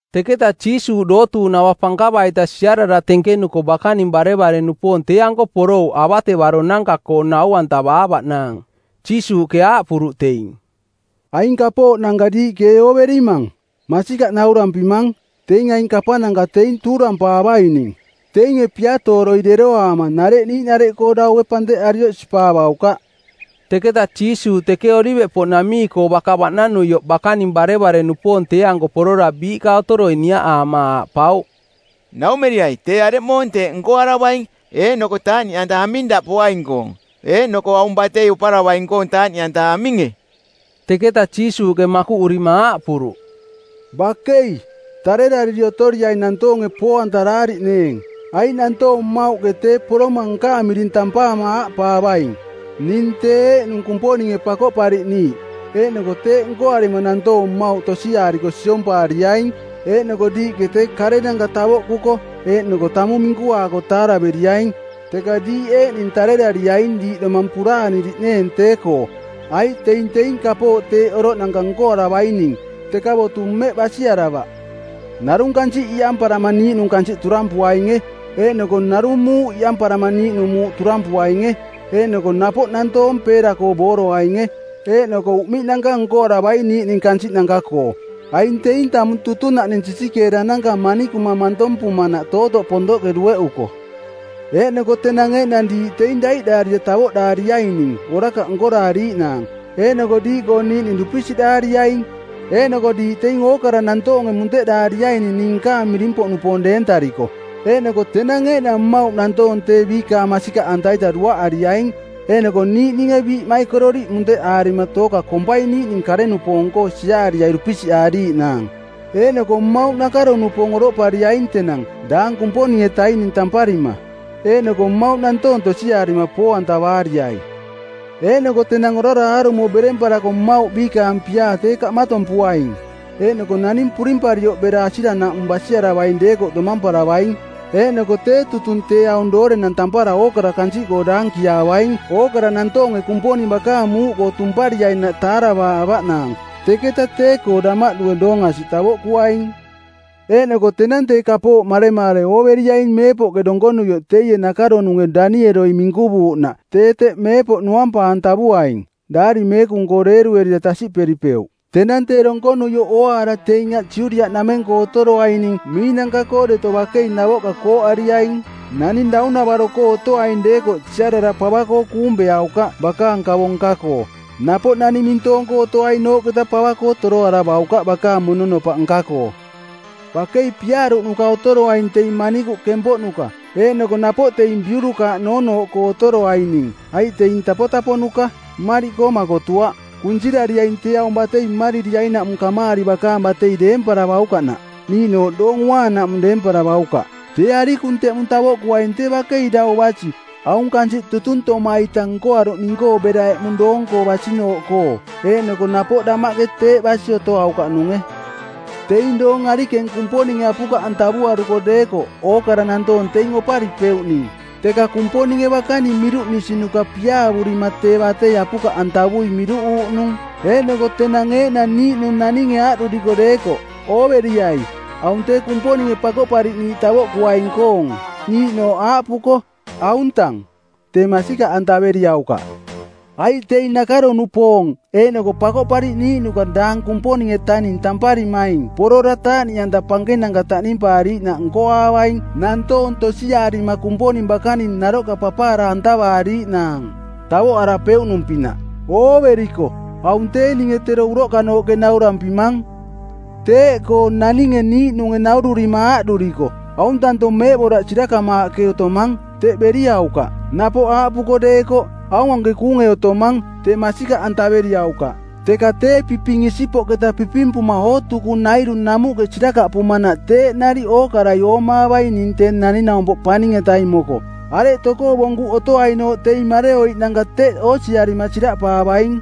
Teketa Jiisuuꞌ dootuuꞌnava pankava-ita siarara tenkenuko bakaning barevare-nupoong tee-anko porouꞌ avatevaronanka-koo nau-antavaavaꞌnaang. Jiisuuꞌke aaꞌpuruꞌ teing, “Aing kapooꞌnanka diiꞌke ee ooverimang? Masikaꞌ naurampimang, teing aing kapananka teing tuurampaavaining. Teinge piatooroi deroaama nareꞌ niiꞌnareꞌkoo daue panteꞌarioꞌ sipaavaukaꞌ.” Teketa Jiisuuꞌ teke Oliveꞌpoꞌnamii-koo baka baꞌnanuioꞌ bakaning barevare-nupoong tee-anko porora biiꞌka otoroi niaꞌaama aaꞌpauꞌ, “Naumeriai tee areꞌmoong teeꞌ nkoaravaing, eeꞌnoko taaꞌniꞌanta aming daꞌ poaing-koong, eeꞌnoko aung batei oparavaing-koong taaꞌniꞌanta aminge?” Teketa Jiisuuꞌke makuꞌurima aaꞌpuruꞌ, “Bakei, tarerariri otoriaing nantoonge poo-antaraariꞌneeng. Aiꞌ nantoong mmauꞌke tee poroma nkaang miring tampaama aaꞌpaavaing, ‘Ning tee eeꞌnung Kumponinge Pakoꞌpariꞌniiꞌ,’ eeꞌnoko teeꞌ nkoarima nantoong mmauꞌ tosiaariko siompaariaing. Eeꞌnoko diiꞌke tee karenanka tavoꞌkuko eeꞌnoko tamung minkuaako taaraveriaing, teka diiꞌ eeꞌning tarerariaing diiꞌ domang puraaniriꞌneeng tee-koo, aiꞌ teing teing kapooꞌ teeꞌ oroꞌnanka nkoaravaining, teka botu mmeꞌ basiaravaꞌ. Narung kansiꞌ iꞌamparama niiꞌnung kansiꞌ turampuainge. Eeꞌnoko narung muuꞌ iꞌamparama niiꞌnung muuꞌ turampuainge. Eeꞌnoko napoꞌ nantoong peera-koo booroainge, eeꞌnoko uꞌmiꞌnanka nkoaravai niiꞌning kansiꞌnanka-koo. Aing teing tamung tutunaꞌning sisikeerananka manikuma mantompumanaꞌ tootoꞌ pontoꞌke dueꞌuko. “Eeꞌnoko tenang eeꞌnang diiꞌ teing daiꞌdaarira tavoꞌdaariaining orakaꞌ nkoraariiꞌnaang, eeꞌnoko diiꞌkoo niiꞌning dupisiꞌdaariaing. Eeꞌnoko diiꞌ teing ookara nantoonge munteꞌdaariaining ning nkaang miring-poꞌnupoong deentariko. Eeꞌnoko tenang eeꞌnang mmauꞌ nantoong tee biikaang masikaꞌanta-ita duaꞌariaing, eeꞌnoko niiꞌninge biiꞌmaikororiꞌ munteꞌaarima tooka kompai niiꞌning kare-nupoong-koo siaariai dupisiꞌaariiꞌnaang. Eeꞌnoko mmauꞌ nakaro-nupoong oroꞌpariaing tenang daang Kumponing-etaining tamparima, eeꞌnoko mmauꞌ nantoong tosiaarima poo-antavaariai. Eeꞌnoko tenang orara aarumo beremparako mmauꞌ biikaang piaa tee kaꞌmatompuaing. Eeꞌnoko naning purimparioꞌ bera asiranaꞌmung basiaravaing deekoꞌ domamparavaing. Eeꞌnoko tee tutung tee aung doorenang tampara ookara kansiꞌkoo daankiaavaing ookara nantoonge Kumponing bakaang muuꞌkoo tumpariainaꞌ taaravaavaꞌnaang, teketa tee-koo damaꞌdue doong asiꞌ tavoꞌkuaing.” “Eeꞌnoko tenang tee kapooꞌ maremaare ooveriaing meepoꞌke donkonuioꞌ teie nakaronunge Danieloi minkuvuuꞌnaꞌ tee teꞌ meepoꞌ nuampa-antavuaing.” (Daari Meekung-koo deeruerira tasiꞌperipeuꞌ.) “Tenang tee donkonuioꞌ ooaara teing aꞌ Judiaꞌnameng-koo otoroaining miinanka-koo deto bakei navoꞌka kooꞌariaing! Naning daunavaro-koo otoaing deekoꞌ siarara pava-koo kuung beaukaꞌ bakaang kavo nka-koo. Napoꞌ naning mintoong-koo otoainooꞌketa pava-koo toroaravaukaꞌ bakaang mononopaꞌ nka-koo. Bakei piaaruꞌnuka otoroaing teing manikuꞌ kempoꞌnuka eeꞌnoko napoꞌ teing biurukaaꞌ noonooꞌkoo otoroaining, aiꞌ teing tapotaponuka, mmariꞌkoo makotuaꞌ. Kunsirariaing tee aung batei mmaririainaꞌmung kamaari bakanang batei deemparavaukaꞌnaꞌ, niiꞌnooꞌ Doong Uaanaꞌmung deemparavaukaꞌ. Tee arikung teꞌmung tavoꞌkuaing tee bakei dau basi aung kansiꞌ tutuntoma-ita nkoaruꞌning-koo bera eꞌmung doong-koo basinooꞌkoo, eeꞌnoko napoꞌ damaꞌke teeꞌ basi otoaukaꞌnunge. Teing doong arikeng Kumponinge apukaꞌantavuaruko deekoꞌ ookara nantoong teing oparipeuꞌning, teka Kumponinge bakaning miruꞌnisinuka piaavurima tee batei apukaꞌantavui miruꞌuuꞌnung. “Eeꞌnoko tenang eeꞌnang niiꞌnung naninge aaꞌduriko deekoꞌ, ‘Ooveriai, aung tee Kumponinge Pakoꞌpariꞌniiꞌ tavoꞌkuaing-koong!’ niiꞌnooꞌ aaꞌpuko, ‘Auntang!’ tee masikaꞌantaveriaukaꞌ. Aiꞌ teing nakaro-nupoong eeꞌnoko pakoꞌpariꞌniiꞌnuka daang Kumponing-etaning tamparimaing porora taaꞌniꞌanta pankenanka taꞌnimpaariiꞌnaꞌ nkoaavaing nantoong tosiaarima Kumponing bakaning naroꞌka papaara-antavaariiꞌnaang, tavoꞌarapeuꞌnung-pinaꞌ. Ooveriko, aung tee ninge tero uroꞌkanooꞌke naurampimang. Teeꞌkoo naninge niiꞌnunge naururima aaꞌduriko, ‘Auntanto meeꞌboraꞌ sirakamaaꞌke otomang,’ teꞌ beriaukaꞌ. Napoꞌ aaꞌpuko deekoꞌ, ‘Aung anke kuunge otomang,’ tee masikaꞌantaveriaukaꞌ. Teka tee piping isipoꞌketa pipimpuma ootukunairu namuꞌke sirakaꞌpumanaꞌ teeꞌ nariꞌ ookarai oomaavaing ning Tee Naning-naumpoꞌ Paning-etaing moko. Areꞌ tokoo bonkuꞌ otoainooꞌ teing mareoiꞌnanka teꞌ oosiarima siraꞌpaavaing.”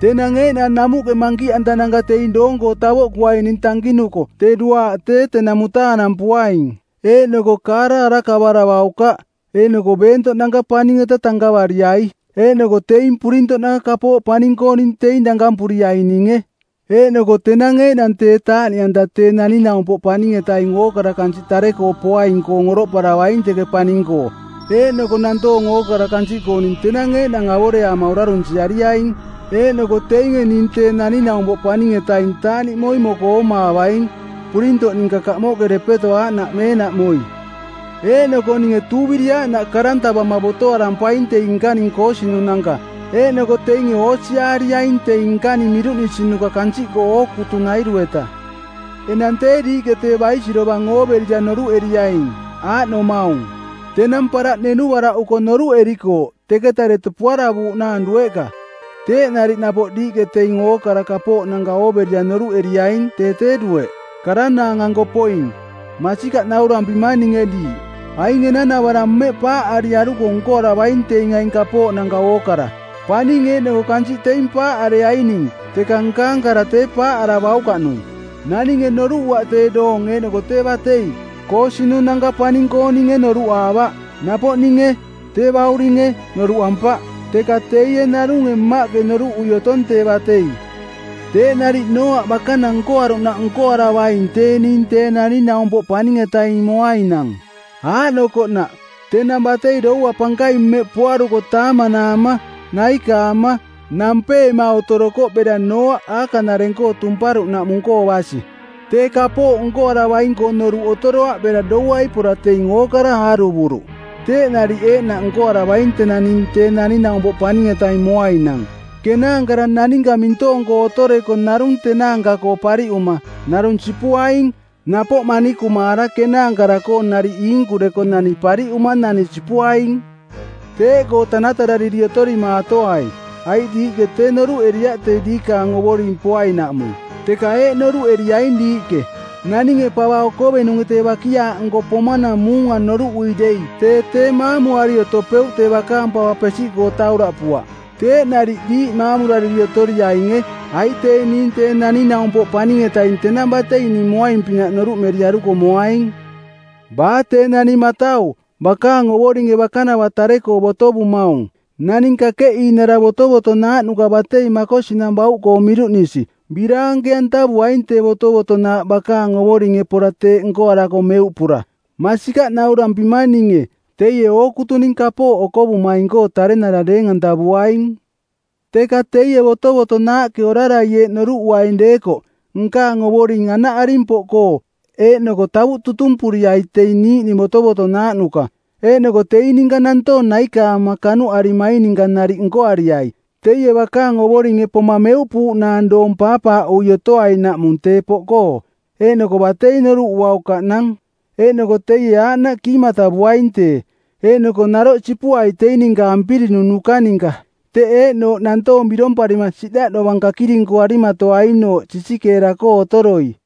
“Tenang eeꞌnang namuꞌke mankiꞌantananka teing doong-koo tavoꞌkuaining tankinuko tee duaaꞌ tee tenang mutaanampuaing, eeꞌnoko kaara arakavaravaukaꞌ, eeꞌnoko beentoꞌnanka paning-eta tankavariai. Eeꞌnoko teing purintoꞌnanka kapooꞌ paning-kooning teing dankampuriaininge. Eeꞌnoko tenang eeꞌnang tee taaꞌniꞌanta Tee Naning-naumpoꞌ Paning-etaing ookara kansiꞌ tare-koo poaing-koong oroꞌparavaing teke paning-koo, eeꞌnoko nantoong ookara kansiꞌkooning tenang eeꞌnang avoreaama orarunsiariaing. Eeꞌnoko teinge ning Tee Naning-naumpoꞌ Paning-etaing taaꞌniꞌmoi moko oomaavaing, purintoꞌ ninka kamoꞌke depeto aaꞌnaꞌ meenaꞌmoi. Eeꞌnoko ninge tuuviri aaꞌnaꞌ karantavama˜ botoarampaing teing nkaning koosinunanka, eeꞌnoko teinge oosiaariaing teing nkaning miruꞌnisinuka kansiꞌkoo ookutunairu-eta. “Enang tee diiꞌke tee baisirovang ooverira noruꞌeriaing, aaꞌnomaung: Tenang paraꞌ nenuvaraꞌuko noruꞌerikooꞌ teketa deto puaravuuꞌnaang dueꞌka. Teeꞌ nariꞌ napoꞌ diiꞌke teing aing ookara kapooꞌnanka ooverira noruꞌeriaing tee tee dueꞌ, karanaang-anko poing. Masikaꞌ naurampimang ninge diiꞌ, aing enanavarang mmeꞌ paaꞌariaruko nkoaravaing teing aing kapooꞌnanka ookara. Paning eeꞌnoko kansiꞌ teing paaꞌareaining teka nkaang kara tee paaꞌaravaukaꞌnung.” “Naninge noruꞌuaꞌ tee doong eeꞌnoko tee batei. Koosinunanka paning-kooninge noruꞌaavaꞌ. Napoꞌ ninge, tee bauringe, noruꞌampaꞌ, teka teie narunge Mmaꞌke noruꞌui otong tee batei. Teeꞌ nariꞌ Nooaꞌ bakanang nkoaruꞌnaꞌ nkoaravaing tee ning Tee Naning-naumpoꞌ Paning-etaing moainang. Aaꞌnokoꞌnaꞌ: tenang batei doua pankaing mmeꞌ poaruko taamanaama, naikaama, nampeema otorokoꞌ bera Nooaꞌ aakaꞌnareng-koo tumparuꞌnaꞌmung-koo basi. Tee kapooꞌ nkoaravaing-koo noruꞌ otoroaꞌ bera douai pora teing ookara aaruvuruꞌ. Teeꞌ nariꞌ eeꞌnaꞌ nkoaravaing tenang ning Tee Naning-naumpoꞌ Paning-etaing moainang. Kenaankara naninka mintoong-koo otoreko narung tenaanka-koo pariꞌuma, narung sipuaing. Napoꞌ manikumaara kenaankara-koo nariꞌ iinkureko nani pariꞌuma nani sipuaing. “Teeꞌkoo tanatarariri otorimaatoai, aiꞌ diiꞌke tee noruꞌeriaꞌ tee diikaang Ovoring poainaꞌmung. Teka eeꞌ noruꞌeriaing diiꞌke, naninge pava okovenunge tee bakiaaꞌnko pomanang muunga noruꞌui dei tee tee maamuari otopeuꞌ tee bakaang pava pesiꞌkoo tauraꞌpuaꞌ. Teeꞌ nariꞌ diiꞌ maamurariri otoriainge, aiꞌ tee ning Tee Naning-naumpoꞌ Paning-etaing tenang batei ning moaing-pinaꞌ noruꞌmeriaruko moaing.” “Baa tee naning matau, bakaang ovoringe bakanava tare-koo botovumaung, naning kakeꞌiinara botovotonaaꞌnuka batei makosinang bauꞌkoo miruꞌnisi, biraanke-antavuaing tee botovotonaaꞌ bakaang ovoringe pora teeꞌ nkoarako meuꞌpura. Masikaꞌ naurampimang ninge, teie ookutuning kapooꞌ okovumaing-koo tarenara deeng-antavuaing. Teka teie botovotonaaꞌke orarai eeꞌ noruꞌuaing deekoꞌ, ‘Nkaang ovoring anaꞌaring poꞌkoo,’ eeꞌnoko tavuꞌ tutumpuriai teing niiꞌning botovotonaaꞌnuka, eeꞌnoko teing ninka nantoong naikaama kanuꞌarimaing ninka nariꞌ nkoariai, teie bakaang ovoringe poma meuꞌpuuꞌnaang doong paapaaꞌui otoainaꞌmung tee poꞌkoo, eeꞌnoko batei noruꞌuaukaꞌnang. Eeꞌnoko teie aaꞌnaꞌ kiimatavuaing tee, eeꞌnoko naroꞌ sipuai teing ninka ampirinunuka ninka, teꞌ eeꞌnooꞌ nantoong biromparima siꞌdaꞌ dovang kakirinkuarimatoainooꞌ sisikeera-koo otoroi.”